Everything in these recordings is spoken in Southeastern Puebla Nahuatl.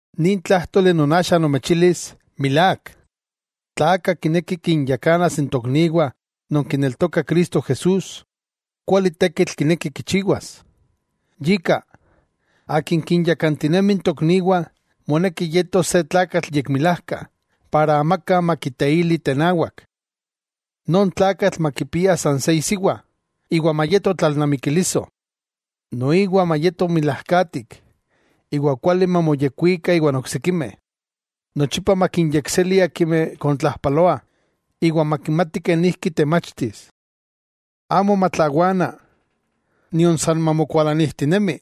Nin tlájtoli non axa nomechilis, milák: tla aka kineki kinyakanas n tokniwah non kineltokah Cristo Jesús, kuali tekitl kineki kichiwas. Yika, akin kinyakantinemi n tokniwah, moneki yetos se tlakatl yekmilajka para amaka makiteili tenawak. Non tlakatl makipia san se isiwa, iwa mayeto tlalnamikiliso. Noiwa mayeto yekmilajka iwa kuali mamoyekkuika iwan oksikimeh. Nochipa makinyekseli icha akimeh kontlajpaloah, iwa makimati kenijki temachtis. Amo matlawana nion san mamokualanijtinemi.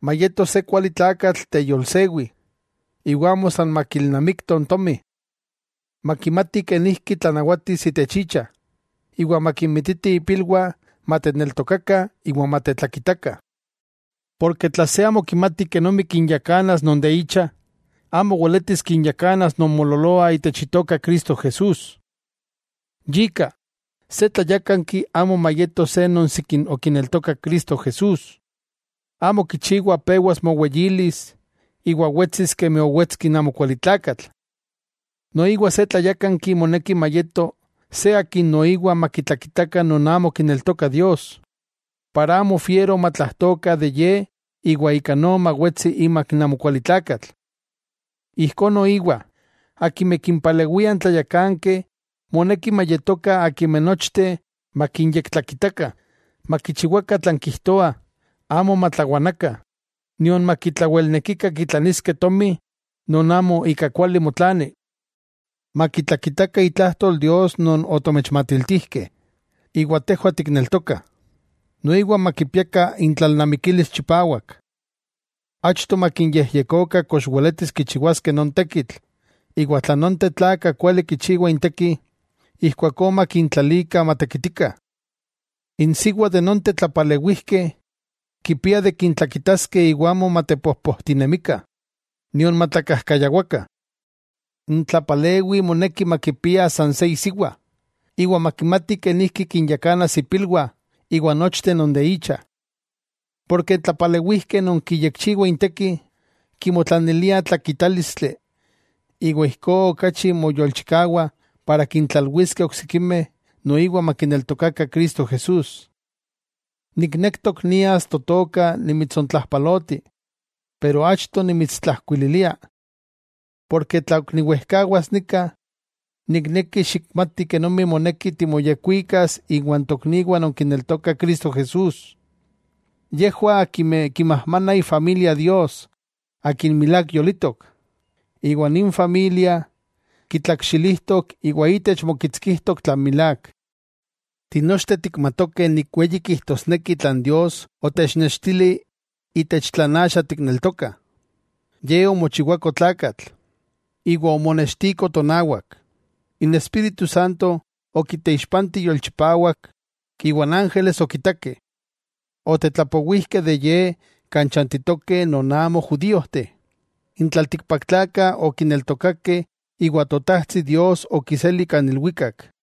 Mayeto se kuali tlakatl teyolsewi, iwa amo san makilnamikto n tomi. Makimati kenijki tlanawatis itech icha, iwa makinmititi ipilwah mateneltokakah iwa matetlakitakah. Porke tla se amo kimati kenomi kinyakanas non de icha, amo weletis kinyakanas non moololoah itech Itoka Cristo Jesús. Yika, se tlayákanki amo mayeto se non sikin okineltokak Cristo Jesús, amo kichiwa pewas moweyilis iwa wetsis kemi owetski n amokualitlakatl. Noiwa se tlayákanki moneki mayeto se akin noiwa makitlakitakah non amo kineltokah Dios, para amo fiero matlajtokah de ye iwa ika no mawetsiti imak n amokualitlakatl. Ijkó noiwa akimeh kimpalewiah n tlayakankeh moneki nochteh makinyektlakitakah, makichiwakah tlan kijtoah, amo matlawanakah, nion makitlawelnekikah kitlaniskeh tomi non amo ika kuali motlani. Makitlakitakah itlajtol Dios non otomechmatiltijkeh, iwa tejwah tikneltokah. Noiwa makipiakah intlalnamikilis chipawak. Achto makinyejyekokah kox weletis kichiwaskeh non tekitl, iwa tla nonteh tlakah kuali kichiwah inteki, ijkuakó makintlalikah matekitikah. Insiwa nonteh tlapalewijkeh kipiah de kintlakitaskeh iwa amo matepojpojtinemikah, nion matlakajkayawakah. N tlapalewi moneki makipia san se isiwa, iwa makimati kenijki kinyakanas ipilwah iwa nochteh non de icha. Porke n tlapalewijkeh non kiyekchiwah inteki, kimotlaniliah tlakitálistli iwa ijkó okachi moyolchikawah kintlalwiskeh oksikimeh noiwa makineltokakah Cristo Jesús. Niknektok nias totoka nimitsontlajpaloti, achto nimitstlajkuililia. Porke tla ok niwejkawas nika, nikneki xikmati kenomi moneki timoyekwikas iwa n tokniwah non kineltokah Cristo Jesús. Yejwah akimeh kimajmanah itlaneltokawah Dios, Akin milák yolitok. Iwa ninteh kitlakxilijtok iwa itech mokitskijtok tlan milák. Tinochteh tikmatokeh nik weyi kijtosneki tlan Dios otechnextili itech tlan axa tikneltokah: Ye omochiwako tlakatl, iwa omonextiko tonawak; n Espíritu okiteixpanti yolchipawak iwa n ángeles okitakeh. Otetlapowijkeh de Ye kan chantitokeh non amo judíojteh. N tlaltikpaktlakah okineltokakeh iwa Totajtsi Dios okiseli kan ilwikak.